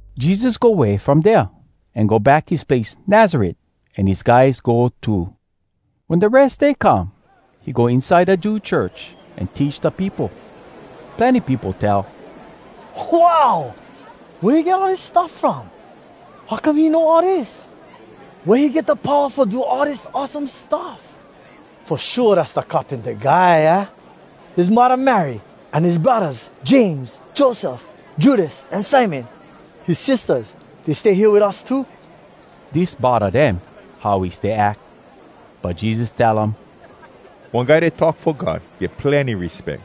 Jesus go way from dea, an go back his place Nazaret, an his guys go too. Wen da Res Day come, he go inside da Jew church an teach da peopo. Plenny peopo tell, “Wow! Wea he get all dis stuff from? How come he know all dis? Wea he get da powa fo do all dis awesome stuff? Fo shua dass da carpinta guy, aah? His muddah Mary, an his braddahs James, Joseph, Judas, an Simon. His sistahs, dey stay hea wit us too.” Dis bodda dem, how he stay ack. But Jesus tell um, “One guy dat talk fo God get plenny respeck.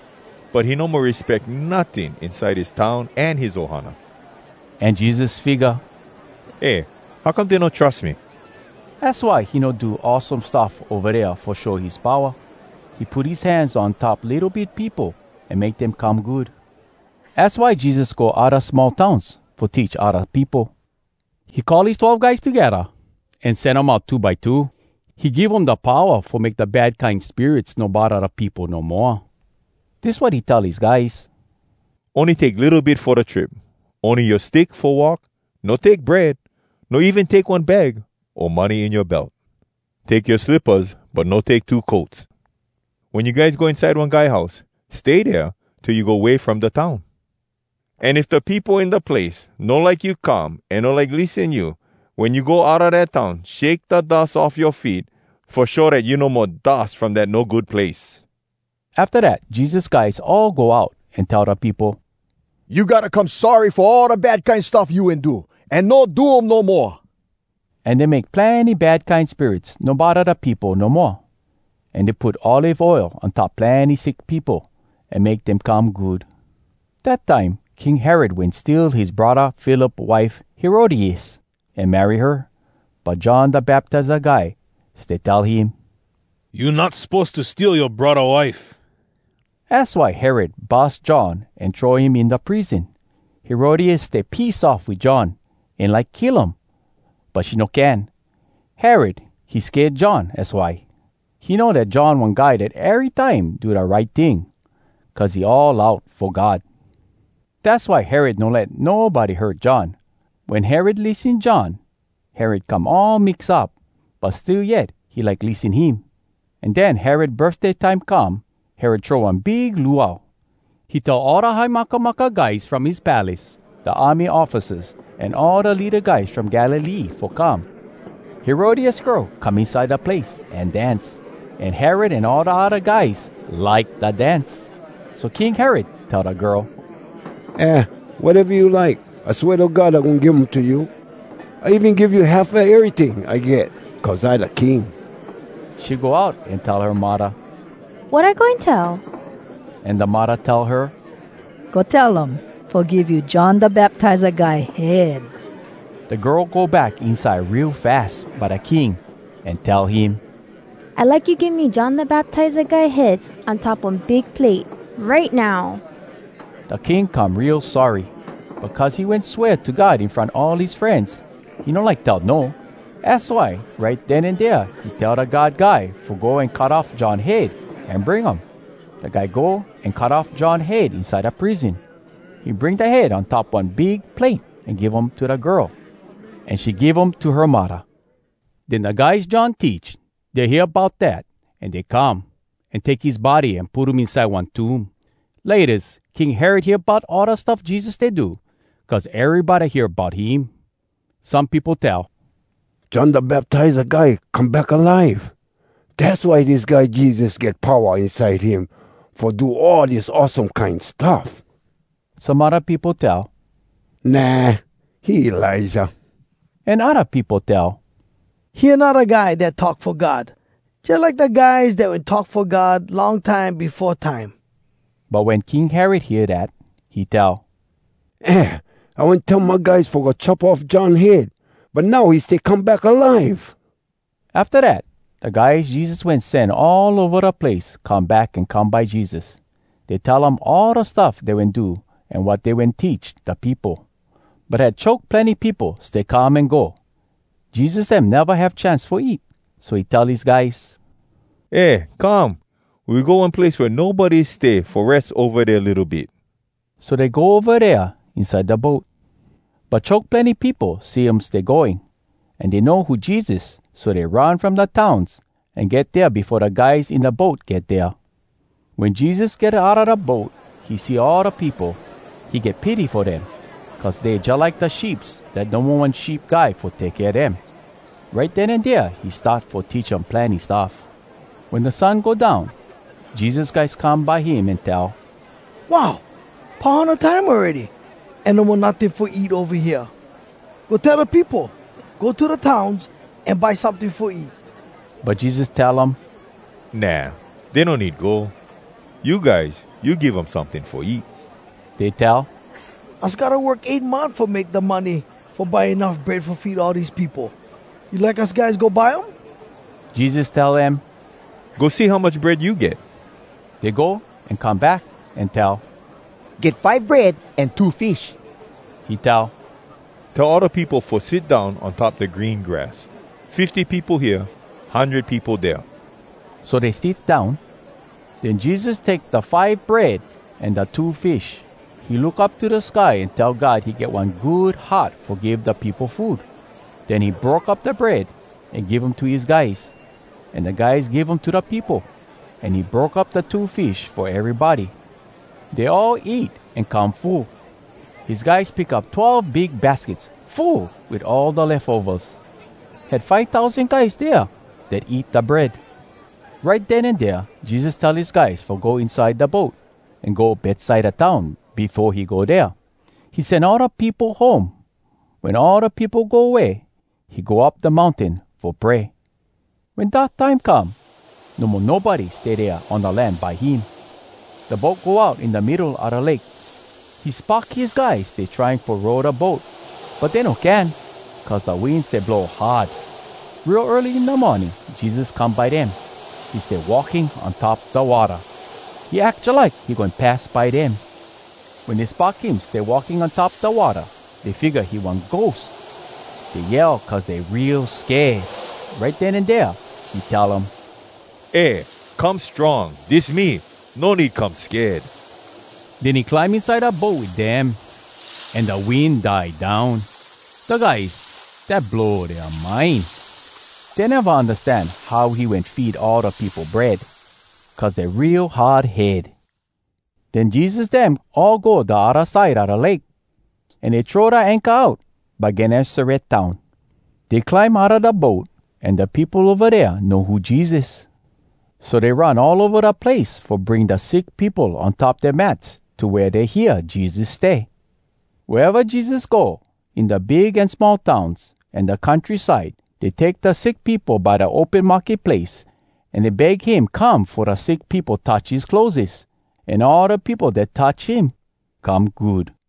But he no mo respeck notting inside his town an his ohana.” An Jesus figga, “Eh, how come dey no trus me?” Az why he no do awesome stuff ova dea fo show his powa. He put his hands on top litto bit peopo, an make dem come good. Az why Jesus go odda small towns fo teach odda peopo. He call his twelve guys togedda, an sen um out two by two. He give um da powa fo make da bad kine spirits no bodda da peopo no moa. Dis wat he tell his guys: “Ony take litto bit fo da trip, ony yoa stick fo walk. No take bread. No even take one bag, o money in yoa belt. Take yoa slippas, but no take two coats. Wen you guys go inside one guy house, stay dea till you go way from da town. An if da peopo in da place no like you come an no like lissen you, wen you go outa dat town, shake da dus off yoa feet, fo show dat you no mo dus from dat no good place.” Afta dat Jesus guys all go out an tell da peopo, “You gotta come sorry fo all da bad kine stuff you wen do, an no do um no moa.” An dey make plenny bad kine spirits no bodda da peopo no moa, an dey put olive oil on top plenny sick peopo, an make dem come good. Dat time, King Herod wen steal his braddah Philip wife Herodias, an marry her. But John Da Baptiza Guy stay tell him, “You not suppose to steal yoa braddah wife.” Az why Herod bus John an throw him in da prison. Herodias stay piss off wit John, an like kill um, but she no can. Herod, he sked John, az why. He know dat John one guy dat erytime do da right ting, cuz he all out fo God. Dass why Herod no let nobody hurt John. Wen Herod lissen John, Herod come all mix up, but still yet he like lissen him. An den, Herod birfday time come. Herod throw one big luau. He tell all da high makamaka guys from his palace, da army officers, an all da leada guys from Galilee fo come. Herodias girl come inside da place an dance, an Herod an all da odda guys like da dance. So King Herod tell da girl, “Eh, wateva you like, I swea to God I goin give um to you. I even give you half a eryting I get cuz I da king!” She go out an tell her muddah, “Wat I goin tell?” An da muddah tell her, “Go tell um fo give you John Da Baptiza Guy head!” Da girl go back inside real fas by da king an tell him, “I like you give me John Da Baptiza Guy head on top one big plate right now!” Da king come real sorry. But cuz he wen swea to God in front all his frenz, he no like tell no. Az why right den an dea he tell da guard guy fo go an cut off John head an bring um. Da guy go an cut off John head inside da prison. He bring da head on top one big plate an give um to da girl. An she give um to her muddah. Den da guys John teach, dey hear bout dat, an dey come, an take his body an put um inside one tomb. Laytas, King Herod hear bout all da stuff Jesus stay do, cuz erybody hear bout him. Some peopo tell, “John Da Baptiza Guy come back alive. Dass why dis guy Jesus get powa inside him fo do all dis awesome kine stuff.” Some odda peopo tell, “Nah, he Elijah.” An odda peopo tell, “He anodda guy dat talk fo God, jalike da guys dat wen talk fo God long time befo time.” But wen King Herod hear dat, he tell, “Eh, I wen tell my guys fo go chop off John head. But now he stay come back alive!” Afta dat, da guys Jesus wen sen all ova da place come back an come by Jesus. Dey tell um all da stuff dey wen do an wat dey wen teach da peopo. But had choke plenny peopo stay come an go. Jesus dem neva have chance fo eat. So he tell his guys, “Eh, come! We go one place wea nobody stay fo res ova dea litto bit.” So dey go ova dea inside da boat. But choke plenny peopo see um stay going, an dey know who Jesus, so dey run from da towns an get dea befo da guys in da boat get dea. Wen Jesus get outa da boat, he see all da peopo. He get pity fo dem, cuz dey jalike da sheeps dat no mo one sheep guy fo take kea dem. Right den an dea he start fo teach um plenny stuff. Wen da sun go down, Jesus guys come by him an tell, “Wow! Pau hana time awready! An no mo notting fo eat ova hea. Go tell da peopo, ‘Go to da towns, an buy someting fo eat!’” But Jesus tell um, “Nah! Dey no need go. You guys, you give um someting fo eat.” Dey tell, “Us gotta work eight month fo make da money fo buy enuff bread fo feed all dese peopo! You like us guys go buy um?” Jesus tell dem, “Go see how much bread you get.” Dey go, an come back, an tell, “Get five bread an two fish.” He tell, “Tell all da peopo fo sit down on top da green grass, fifty peopo hea, hundred peopo dea.” So dey sit down. Den Jesus take da five bread an da two fish. He look up to da sky, an tell God he get one good heart fo give da peopo food. Den he broke up da bread an give um to his guys, an da guys give um to da peopo. An he broke up da two fish fo erybody. Dey all eat an come full. His guys pick up twelve big baskets full wit all da lefovas. Had five tousan guys dea dat eat da bread. Right den an dea Jesus tell his guys fo go inside da boat, an go Betsaida town befo he go dea. He sen all da peopo home. Wen all da peopo go way, he go up da mountain fo pray. Wen dark time come, no mo nobody stay dea on da land by him. Da boat go out in da middo a da lake. He spock his guys stay trying fo row da boat, but dey no can, cuz da wind stay blow hard. Real early in da morning Jesus come by dem. He stay walking on top da watta. He ack jalike he goin pass by dem. Wen dey spock him stay walking on top da watta, dey figga he one ghost. Dey yell cuz dey real sked! Right den an dea he tell um, “Eh! Come strong! Dis me! No need come sked!” Den he climb inside da boat wit dem, an da wind die down. Da guys, dat blow dea mind! Dey neva undastan how he wen feed all da peopo bread, cuz dey real hard head. Den Jesus dem all go da odda side a da lake, an dey throw da anchor out by Gennesaret town. Dey climb outa da boat, an da peopo ova dea know who Jesus. So dey run all ova da place fo bring da sick peopo on top dea mats to wea dey hear Jesus stay. Wea eva Jesus go, in da big an small towns, an da country side, dey take da sick peopo by da open market place. An dey beg him come fo da sick peopo touch his clotheses. An all da peopo dat touch him come good.